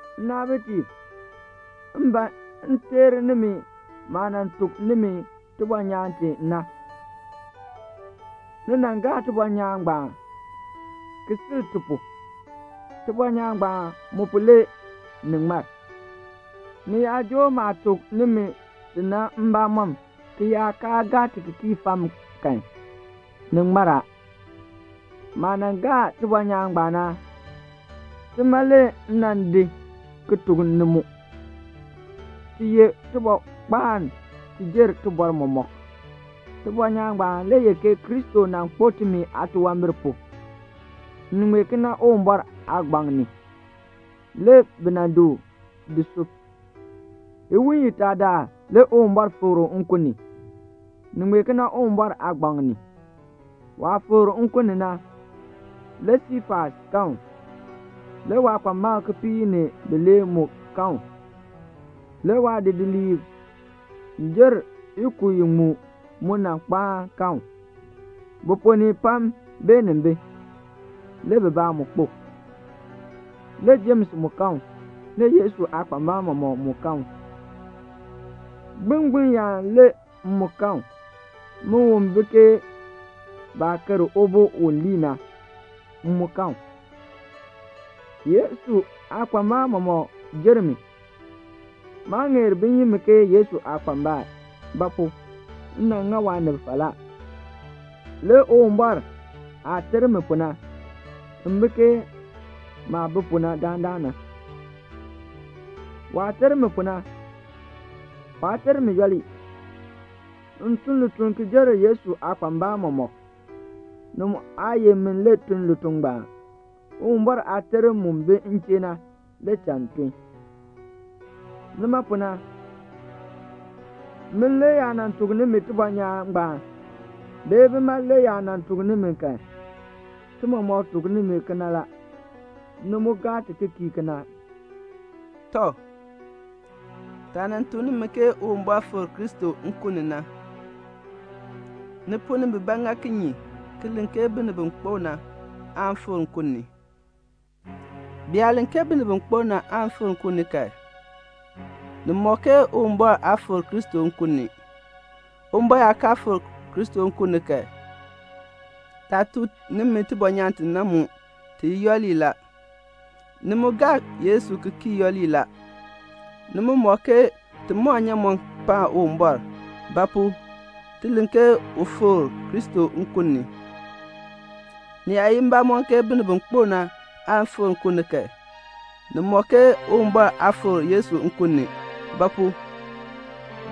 Nnaabitiib, m ban m teer nimi maah nan tuk nimi tibɔnyaan ti na. Ni nan gaa tibɔnyaan ngbaan, ki sil ti pu. Tibɔnyaan ngbaan mu pu le ni ŋmar. Ni yaa joo maah tuk nimi ti na mbamɔm, ki yaa kaa gaa ti ki kii fam kan, ni ŋmar a. Maah nan gaa tibɔnyaan ngbaan na, tima le m nan di ki tuk ni mu. Ti ye tibɔrkpaan ki jer tibɔr mɔmɔk. Tibɔnyaan ngbaan le ye ke Kristo nan kpo timi aatunwambir pu. Ni ŋmee kena Uwumbɔr aagbaŋ ni. Le bi nan di u di sub. Iwiin itaa daal le Uwumbɔr fikr u nkun ni. Ni ŋmee kena Uwumbɔr aagbaŋ ni. Waah fikr nkun ni na, le Siifas kan u. Le waakpambalb kipiik ni bilee mu kan u. Le waadidiliib jer ikub iŋmu mu nan kpaan kan u. Bi ponn ni pam beenin bi, le bibaa mu kpo. Le Jems mu kan u. Le Yesu aakpambalb mɔmɔk mu kan u. Gbilngbiln yaan le m mu kan u. Min u bi ke baah ker ubo u lii na, m mu kan u. Yesu aakpambalb mɔmɔk jer mi. Maa ŋeer bin yi mi ke Yesu aakpambal; ba pu? m nan ŋa waanib falaa. Le Uwumbɔr aah ter mi pu na, m bi ke maah bi pu dandana na. Waah ter mi pu na, waa ter mi yooli. M tun lituln ki jer Yesu aakpambalb mɔmɔk. Ni mu aa ye min le tun lituln ngbaan. Uwumbɔr aaterm mu bi m chee na, le cha m tun. Nima pu na, min le yaa nan tuk nimi tibɔnyaan ngbaan, bee bima le yaa nan tuk nimi kan, ti mɔmɔk tuk nimi kena la, ni mu gaa ti ki kii kena la. Tɔ, taah nan tuk nimi ke Uwumbɔr fikr Kristo nkun ni na, ni ponn ni bibaa ŋa kinye ki len ke binib bi kpo na aan fikr nkun ni. Bi yaa len ke binib bi kpo na aan fikr nkun ni kan, ni ŋmɔk ke Uwumbɔr aa fikr Kristo nkun ni. Uwumbɔr yaa kaa nan fikr Kristo nkun ni kan, taah tuk nimi tibɔnyaan ti na mu, ti ye yooli la. Ni mu gaa Yesu ki kii yooli la; ni mu ŋmɔk ke ti mɔn nnyaamɔn paan Uwumbɔr; ba pu? ti len ke u fikr Kristo nkun ni. Ni yaa ye mbamɔn ke binib bi kpo na aan fikr nkun ni kan, ni ŋmɔk ke Uwumbɔr aa fikr Yesu mu nkun ni. Ba pu?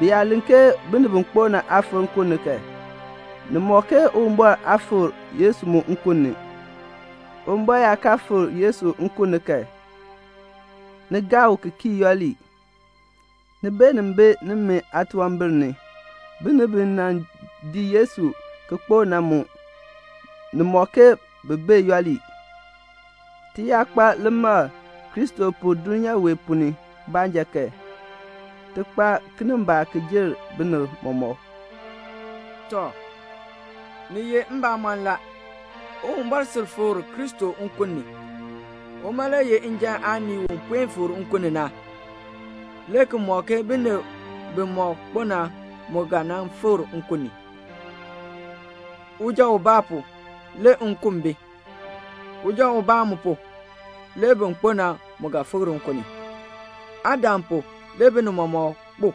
Bi yaa len ke binib bi kpo na aan fikr nkun ni kan, ni ŋmɔk ke Uwumbɔr aa fikr Kristo mu nkun ni. Uwumbɔr yaa kaa nan fikr Kristo nkun ni kan, ni gaa u ki kii yooli, ni beenin bi nimi aatunwambir ni. Binib bi nan dii Yesu ki kpo na mu, ni ŋmɔk ke bi mu bee yooli. Ti yaa kpa limakl Kristo pu dulnyaa wee ponn ni baanja kan, ti kpa kinimbaak ki jer binib mɔmɔk. Tɔ, ni ye mbamɔn la, Uwumbɔr sil fikr Kristo nkun ni. Uma le ye njan aanii u puen fikr nkun ni na, le ki mɔk ke binib bimɔk kpo na mu ga nan fikr nkun ni. Uja ubaa pu, le nkun bi. Uja ubaa mu pu, le bin kpo na mu ga fikr nkun ni. Adam pu, le binib mɔmɔk kpu.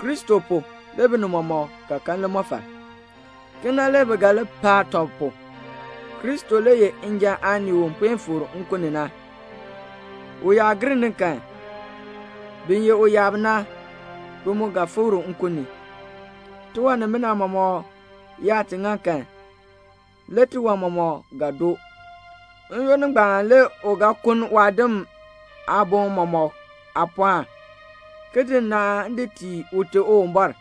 Kristo pu, le binib mɔmɔk ga kan limɔfal. Kena le bi ga li paa tɔb pu. Kristo le ye njan aanii u puen fikr nkun ni na. U yaa gir ni kan, bin ye uyaab na, bi mu ga fikr nkun ni. Tiwan nimina mɔmɔk yaa ti ŋa kan, le tiwan mɔmɔk ga doo. N-yoonn ngbaan le u ga kuln waadim aaboŋ mɔmɔk aapɔɔn, ki di nnaan di tii Ute Uwumbɔr,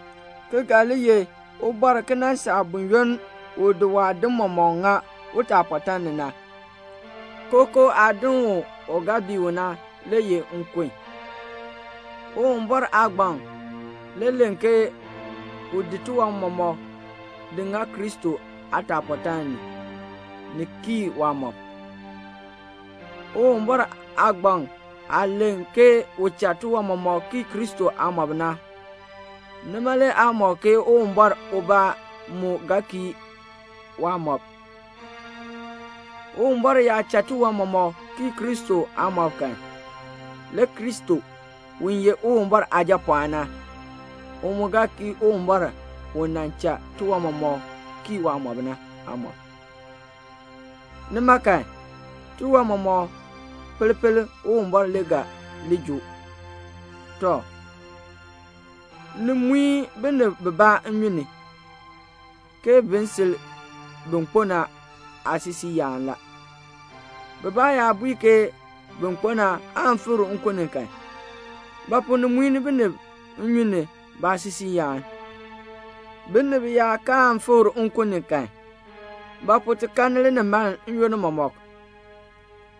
ki ga li ye Ubɔr ki nan saa buyoonn u di waadim mɔmɔk ŋa utaapɔtaan ni na. Kookoo aadin u ga bii u na le ye nkun. Uwumbɔr aagbaŋ le len ke u di tiwan mɔmɔk di ŋa Kristo aataapɔtaan ni, ni kii waamɔb. Uwumbɔr aagbaŋ aah len ke u cha tiwan mɔmɔk kii Kristo aamɔb na, nima le aa ŋmɔk ke Uwumbɔr ubaa mu ga kii waamɔb. Uwumbɔr yaa cha tiwan mɔmɔk kii Kristo aamɔb kan, le Kristo, u ye Uwumbɔr Aajapɔɔn na, u mu ga kii Uwumbɔr u nan cha tiwan mɔmɔk kii waamɔb na, aamɔb. Nima kan, tiwan mɔmɔk pel pel Uwumbɔr le ga li joo. Tɔ, ni muin binib bibaa nnyun ni, ke bin sil bin kpo na aasisiiyaan la. Bibaa yaa bui ke bin kpo na aan fikr nkun ni kan, ba pu ni muin binib nnyun ni baasisiiyaan? Binib yaa kaan fikr nkun ni kan, ba pu ti kanni linimaln n-yoonn mɔmɔk?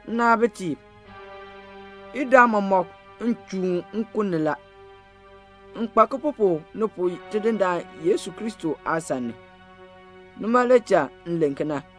Nnaabitiib, idaa mɔmɔk m chuun nkun ni la. M kpa kipupuk ni pu Tidindaan Yesu Kristo aasan ni, nima le cha m len kena.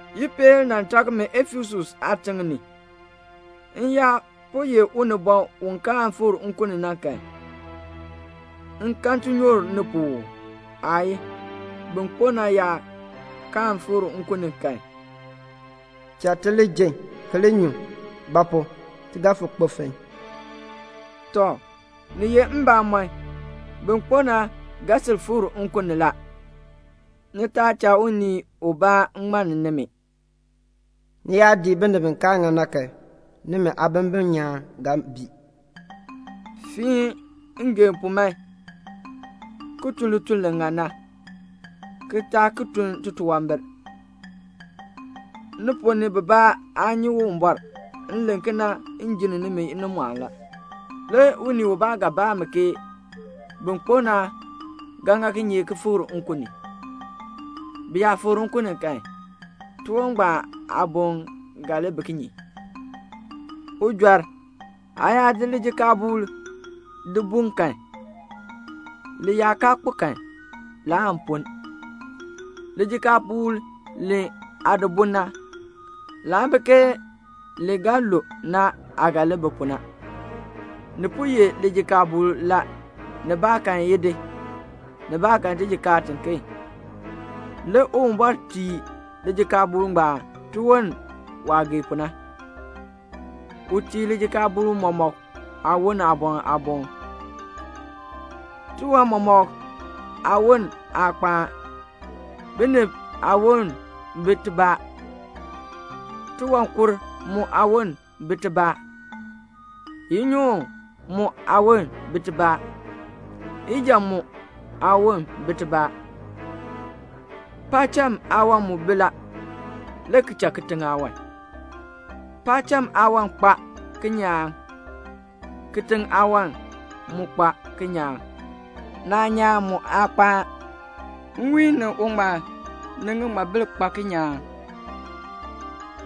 Ipeel nan tak mi Efesus aatiŋ ni. M yaa po ye unibɔn u kaan fikr nkun ni kan, m kan tinyoor ni pu uu? Aayii. Bin kpo na yaa kaan fikr nkun ni kan, "Cha ti li ji ki li nyu; ba pu? ti ga fo kpo fon." Tɔ, ni ye mbamɔn, bin kpo na ga sil fikr nkun ni la. Ni taa cha unii ubaa ŋmann nimi man. "Ni yaa dii binib bi kaa ŋan na kan, nimi aabimbin nyaan ga bii." Fiin ngeen pu man, ki tun lituln li ŋan na, ki taa ki tun titunwambir. Ni ponn ni bibaa aa nyi Uwumbɔr. M len kena ke m jinn nimi inimɔɔn la. Le unii ubaa ga baa ke "Bin kpo na ga ŋa kinye ki fikr nkun ni? Bi yaa fikr nkun ni kan, tiwon ngbaan aaboln ga li bi kinye?" Ujɔr, aa yaa di lijikaabuul di bun kan, li yaa kaa kpo kan, laan punn. Lijikaabuul li aa di bun na, laa bi ke li ga lu na aah ga li bi pu na. Ni po ye lijikaabuul la, nibaakan idi, nibaakan tijikaar tiken. Le Uwumbɔr tii lijikaabuul ngbaan tiwon waah gee pu na. U tii lijikaabuul mɔmɔk aawon aaboŋ aaboŋ. Tiwan mɔmɔk aawon aa kpaan. Binib aawon bi tibaa, tiwankur mu aawon bi tibaa, inyoon mu aawon bi tibaa, ijan mu aawon bi tibaa. Paacham aawan mu bi la, le ki cha kitiŋ aawan. Paacham aawan kpa kinyaan, kitiŋ aawan mu kpa kinyaan. Naanyaan mu aa kpaan. Nwiin ni uŋmal ni ŋiŋmabil kpa kinyaan;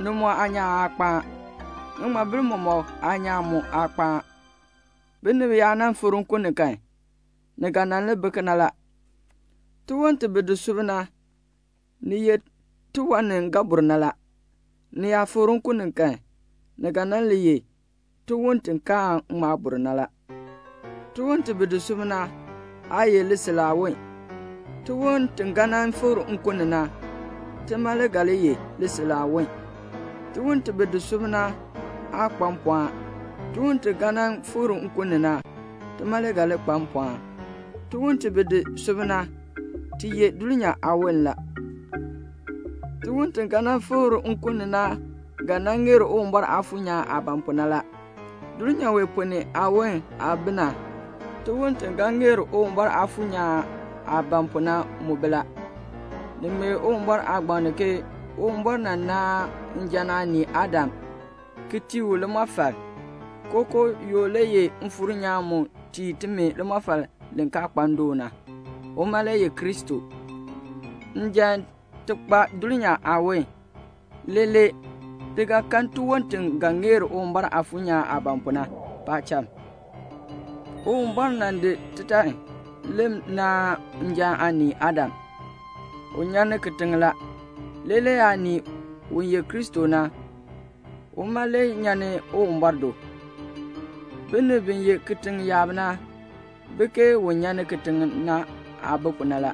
ni mu aanyaan aa kpaan; ŋiŋmabil mɔmɔk aanyaan mu aa kpaan. Binib yaa nan fikr nkun ni kan, ni ga nan li bi kena la. Tiwon ti bi di sub na, ni ye tiwan ni ga bur na la. Ni yaa fikr nkun ni kan, ni ga nan li ye tiwon ti kaan ŋma bur na la. Tiwon ti bi di sub na, aa ye lisil aawon. Tiwon ti ga nan fikr nkun ni na, tima le ga li ye lisil aawon. Tiwon ti bi di sub na aa kpa mpɔɔn. Tiwon ti ga nan fikr nkun ni na, tima le ga li kpa mpɔɔn. Tiwon ti bi di sub na, ti ye dulnyaa aawon la. Tiwon ti ga nan fikr nkun ni na ga nan ŋeer Uwumbɔr Aafuur nyaan aah ban pu na la. Dulnyaa wee ponn ni aawon aah bi na, tiwon ti ga ŋeer Uwumbɔr Aafuur nyaan aah ban pu na mu bi la. Ni ŋmee Uwumbɔr aagbaŋ ni ke Uwumbɔr nan naan njan aanii Adam, ki tii u limɔfal. Kookoo yoo le ye Mfuur nyaan mu tii timi limɔfal li kaa kpa ndoon na. Uma le ye Kristo. Njan ti kpa dulnyaa aawon. Leelee le ti ga kan tiwon ti ga ŋeer Uwumbɔr Aafuur nyaan aah ban pu na, paacham. Uwumbɔr nan di titan le naan njan aanii Adam. U nyan ni kitiŋ la. Leelee aanii, u ye Kristo na, uma le nyan ni Uwumbɔr do. Binib bi ye kitiŋ yaab na bi ke un nyan ni kitiŋ na aah bi pu na la.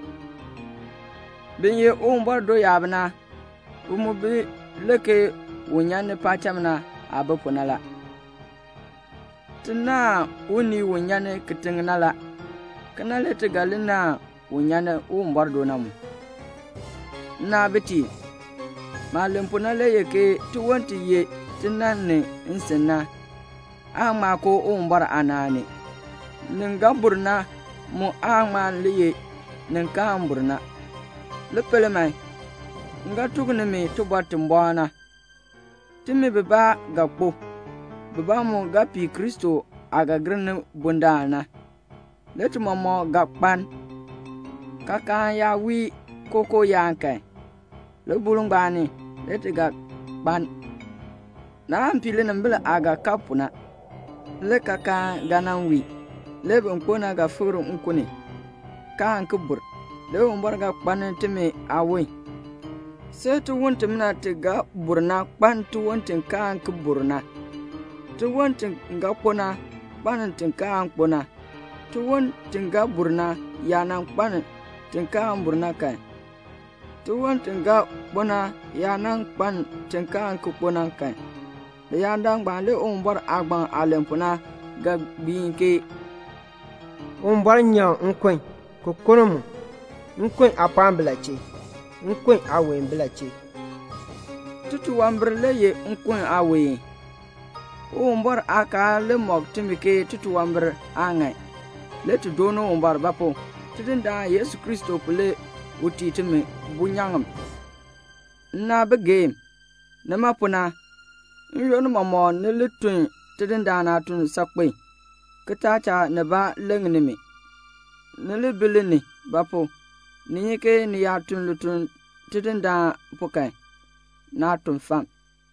Bin ye Uwumbɔr do yaab na, bi mu bi le ke un nyan ni paacham na aah bi pu na la. Ti naahn unii u nyan ni kitiŋ na la. Kena le ti ga li naahn un nyan ni Uwumbɔr do na mu. Nnaabitiib, maah len pu na le ye ke tiwon ti ye tinann ni nsin na, aan ŋma koo Uwumbɔr aanaan ni. Nin ga bur na mu aan ŋma le ye nin kaan bur na. Li pel man, m ga tuk nimi tibɔr ti bɔɔ na. Timi bibaa ga kpo, bibaa mu ga pii Kristo aah ga gir ni bundaln na. Le ti mɔmɔk ga kpaln. Kaakaan yaa wii kookoo yaan kan, libuul ngbaan ni le ti ga kpaln. Naan pii linimbil aah ga kab pu na. Le kaakaan ga nan wii, le bin kpo na ga fikr nkun ni, kaan ki bur. Le Uwumbɔr ga kpaln timi aawon. See tiwon timina ti ga bur na kpaln tiwon ti kaan ki bur na, tiwon ti ga kpo na kpaln ti kaan kpo na. Tiwon ti ga bur na yaa nan kpaln ti kaan bur na kan, tiwon ti ga kpo na yaa nan kpaln ti kaan ki kpo na kan, leyaadaal ngbaan le Uwumbɔr aagbaŋ aah len pu na ga gbiin ke "Uwumbɔr nyaŋ nkun, ki kuln mu. Nkun aapɔɔn bi la chee? Nkun aaween ki bi la chee?" Titunwambir le ye nkun aaween. Uwumbɔr aakaal le mɔk timi ke titunwambir aa ŋan. Le ti dooni Uwumbɔr; ba pu? Tidindaan Yesu Kristo pu le u tii timi bunyaŋ. Nnaabigeem, nima pu na, n-yoonn mɔmɔk ni li tun Tidindaan aatuln saakpen, ki taa cha nibaa leŋ nimi. Ni li bi li ni; ba pu? ni nyi ke ni yaa tun lituln Tidindaan pu kan, naa tun fam.